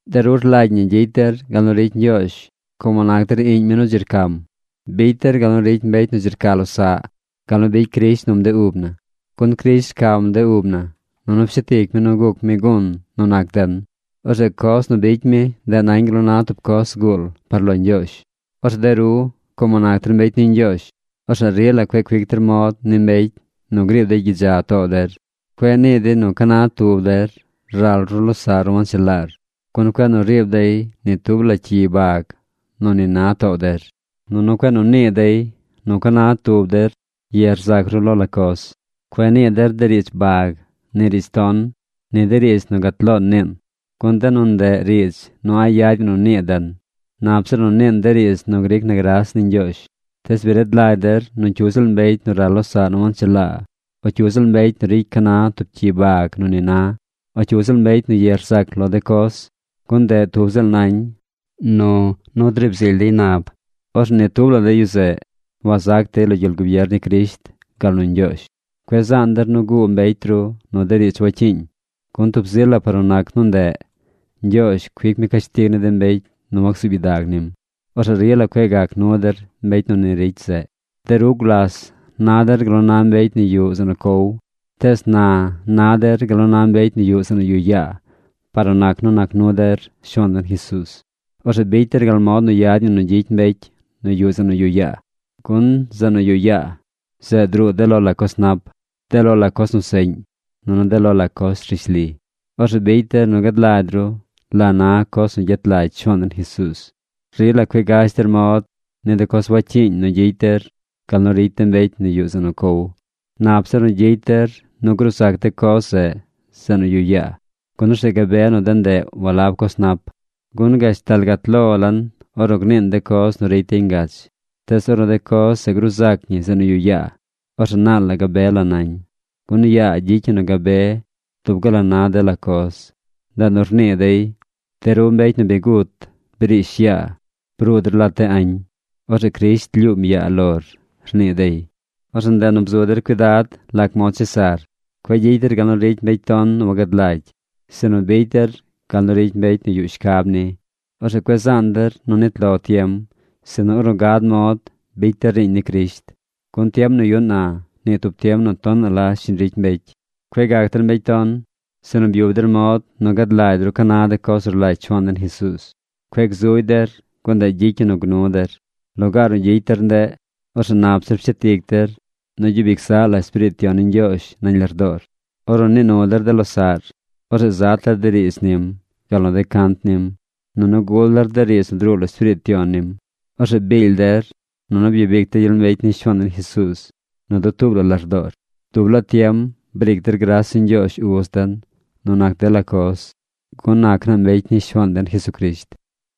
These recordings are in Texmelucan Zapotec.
De ru rlagy ñi gyicy der gal nu ricy Ñgyoozh como nac der iꞌñ mi nu dzi rcam. Bicy der gal nu ricy mbecy nu dzi rca losaꞌ gal nu bicy Crisht num de ub na. Gun Crisht rcam de ub na nunu pshet ic mi nu guc mi gun nu nac den. Orzeꞌ coz nu bicy mi, ndeꞌ nañ gal nu na tub coz zguul par lo Ñgyoozh. Orzeꞌ de ru, como nac der mbecy ni Ñgyoozh, orzeꞌ rila cueꞌ cuic der mod ni mbecy nu griib dey gyidza too der. Cueꞌ nii dey nu ca na tub der ral ru losaꞌr nu wanchelaar, gun cueꞌ nu riib dey ni tub la cyi bag nu ni na too der. Nunu cueꞌ nu nii dey nu ca na tub der ye rzac ru lo la coz. Cueꞌ nii der riidz bag, ni riidz ton, ni de riidz nu gat loon niin. Gun de nu ndeꞌ riidz nu a̱ꞌ yad ñi nu nii den. Nap zir nu niin de riidz nu gric na gras ni Ñgyoozh. Tees bi rad lagy der nu cyu ziꞌl mbecy nu ral losaꞌ nu wanchelaa, o cyu ziꞌl mbecy nu ricy ca na tub cyi bag nu ni na, o cyu ziꞌl mbecy nu ye rzac lo de coz, (gun ndeꞌ tub ziꞌl nañ nu nu driib zily dey nab), orzeꞌ ni tub la de yu zeꞌ wac zac dey lo gyel gubier ni Crisht gal nu Ñgyoozh. Cueꞌ zaan der nu guu mbecy ru nu de riidz wacyiiñ, gun tub zi la par nu nac nu ndeꞌ, Ñgyoozh cuic mi cashtig ni de mbecy nu wacsuub gyidag nim. Orzeꞌ rila cueꞌ gac nu der mbecy nu ni ricy zeꞌ. De ru gulas na der gal nu na mbecy nu yuꞌ zeꞌ nu cow. Tees na na der gal nu na mbecy nu yuꞌ zeꞌ nu yuꞌ yaa par nu nac nu nac nu der Shuaan den Jesuuz. Orzeꞌ bicy der gal mod nu yad ñi nu gyicy mbecy nu yuꞌ zeꞌ nu yuꞌ yaa. Gun zeꞌ nu yuꞌ yaa, zeꞌ druu de lo la coz nap, de lo la coz nu seꞌñ, nunu de lo la coz rishli. Orzeꞌ bicy der nu gad lagy ru la na coz nu gyet lagy Shuaan den Jesuuz. Rila cueꞌ gash der mod ni de coz wacyiiñ nu gyicy der gal nu ricy de mbecy nu yuꞌ zeꞌ nu cow. Nap zir nu gyicy der nu gruu zac de coz zeꞌ zeꞌ nu yuꞌ yaa, gun orzeꞌ gabe nu de ndeꞌ walab coz nap. Gun gashtal gat lo lan ornu gniin de coz nu ricy dey ngach. Tees ornu de coz zeꞌ gruu zac ñi zeꞌ nu yuꞌ yaa, orzeꞌ naal la gabe la nañ. Gun yaa gyicy ñi nu gabe dub gal la na dela coz. Ndeꞌ nu rnii dey: De ru mbecy nu bi gut briish yaa. Bruu der lat de añ. Orzeꞌ Crisht lyuum yaa lor, rnii dey. Orzeꞌ ndeꞌ nu bzu der cuidad lac mod chesar. Cueꞌ gyicy der gal nu ricy mbecy ton nu wagad lagy, sinu bicy der gal nu ricy mbecy nu yuꞌ shcab ni. Orzeꞌ cueꞌ zaan der nu nit lo tiem, sinu ornu gad mod bicy der riiñ ni Crisht, gun tiem nu yuꞌn na, nii tub tiem nu tonaꞌ la shiñ ricy mbecy. Cueꞌ gac der mbecy ton. Sinu byub der mod nu gad lagy ru ca na de coz nu rlagy Shuaan den Jesuuz. Cueꞌ gzugy der, gun ndeꞌ gyicy ñi nu gnu der. Lugaar nu gyicy der ndeꞌ, orzeꞌ nap zir pshet ic der nu gyub ic zaꞌ la Espiriit Yon ni Ñgyoozh nañ lardoor. Ornu nii nu der de losaꞌr, orzeꞌ zat der de riidz nim, gal nu de cant nim, nunu gul der de riidz nu druu lo Espiriit Yon nim. Orzeꞌ biil der, nunu byabic der gyel mbecy ni Shuaan den Jesuuz nu dutuub la lardoor. Dub laa tiem briic der gras ni Ñgyoozh Uz den nu nac dela coz, gun nac naa mbecy ni Shuaan den Jesucrisht.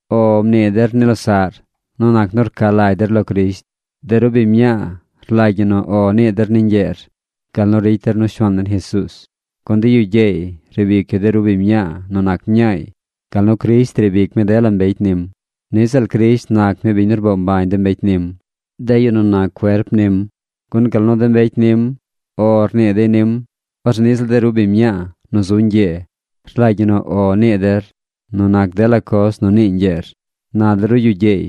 “O” mnii der ni losaꞌr nu nac nu rca lagy der lo Crisht. De ru biñ mñaa rlagy ñi nu “O” nii der ni ñgyeer gal nu ricy der nu Shuaan den Jesuuz. Gun de yu gyeey riib ic yu de ru biñ mñaa nu nac mñaay gal nu Crisht riib ic mi dela mbecy nim. Niꞌ ziꞌl Crisht nac mi biñ nu rboo mbañ de mbecy nim, de yu nu nac cuerp nim. Gun gal nu de mbecy nim “O” rnii dey nim, orzeꞌ niꞌ ziꞌl de ru biñ mñaa nu zu ñgyee rlagy ñi nu “O” nii der nu nac dela coz nu nii ñgyeer. Na de ru yu gyeey,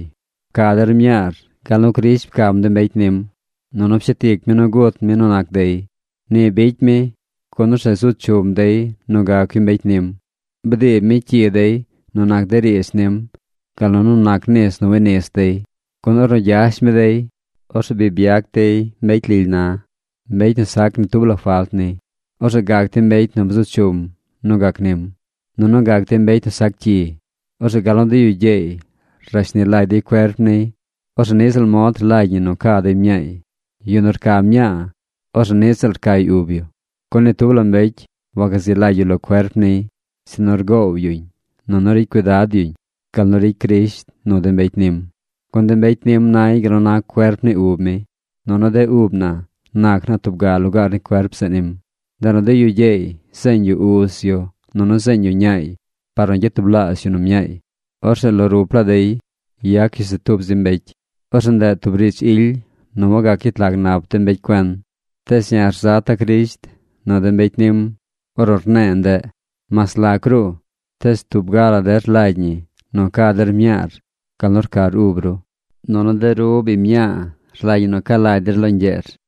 pca der mñaar gal nu Crisht pcam de mbecy nim, nunu pshet ic mi nu gut mi nu nac dey. Ni bicy mi, gun orzeꞌ zu chum dey nu gac yu mbecy nim. Bdiib mi cyi dey nu nac de riidz nim gal nu nu nac nis nu winis dey. Gun ornu gyash mi dey, orzeꞌ bi byac dey mbecy lily na, mbecy nu sac ni tub la falt ni. Orzeꞌ gac dey mbecy nu bzu chum nu gac nim. Nunu gac dey mbecy nu sac cyi. Orzeꞌ gal nu de yu gyeey rashni lagy dey cuerp niy. Orzeꞌ niꞌ ziꞌl mod rlagy ñi nu ca dey mñaay. Yu nu rca mñaa, orzeꞌ niꞌ ziꞌl rcay ub yu. Gun ni tub la mbecy wagazi lagy yu lo cuerp niy, sinu rgoow yuñ nunu ricy cuidad yuñ, gal nu ricy Crisht nu de mbecy nim. Gun de mbecy nim nay gal nu na cuerp ni ub mi. Nunu de ub na nac naa tub ga lugaar ni cuerp zeꞌ nim. “Ndeꞌ nu de yu gyeey zeeñ yu uz yu nunu zeeñ yu ñaay par nu gyatublaazh yu nu mñaay. Orzeꞌ lo rup laa dey yac yu se tub zi mbecy.” Orzeꞌ ndeꞌ tub riidz ily nu wagac gyet lag nap de mbecy cuen. Tees ya̱ rzata̱ Crisht nu de mbecy nim ornu rne̱e̱ ndeꞌ. Mas lac ruꞌ, tees tub ga la der rlagy ñi nu ca der mñaar gal nu rcar ub ru. Nunu de ru biñ mñaa rlagy ñi nu ca lagy der lo ñgyeer.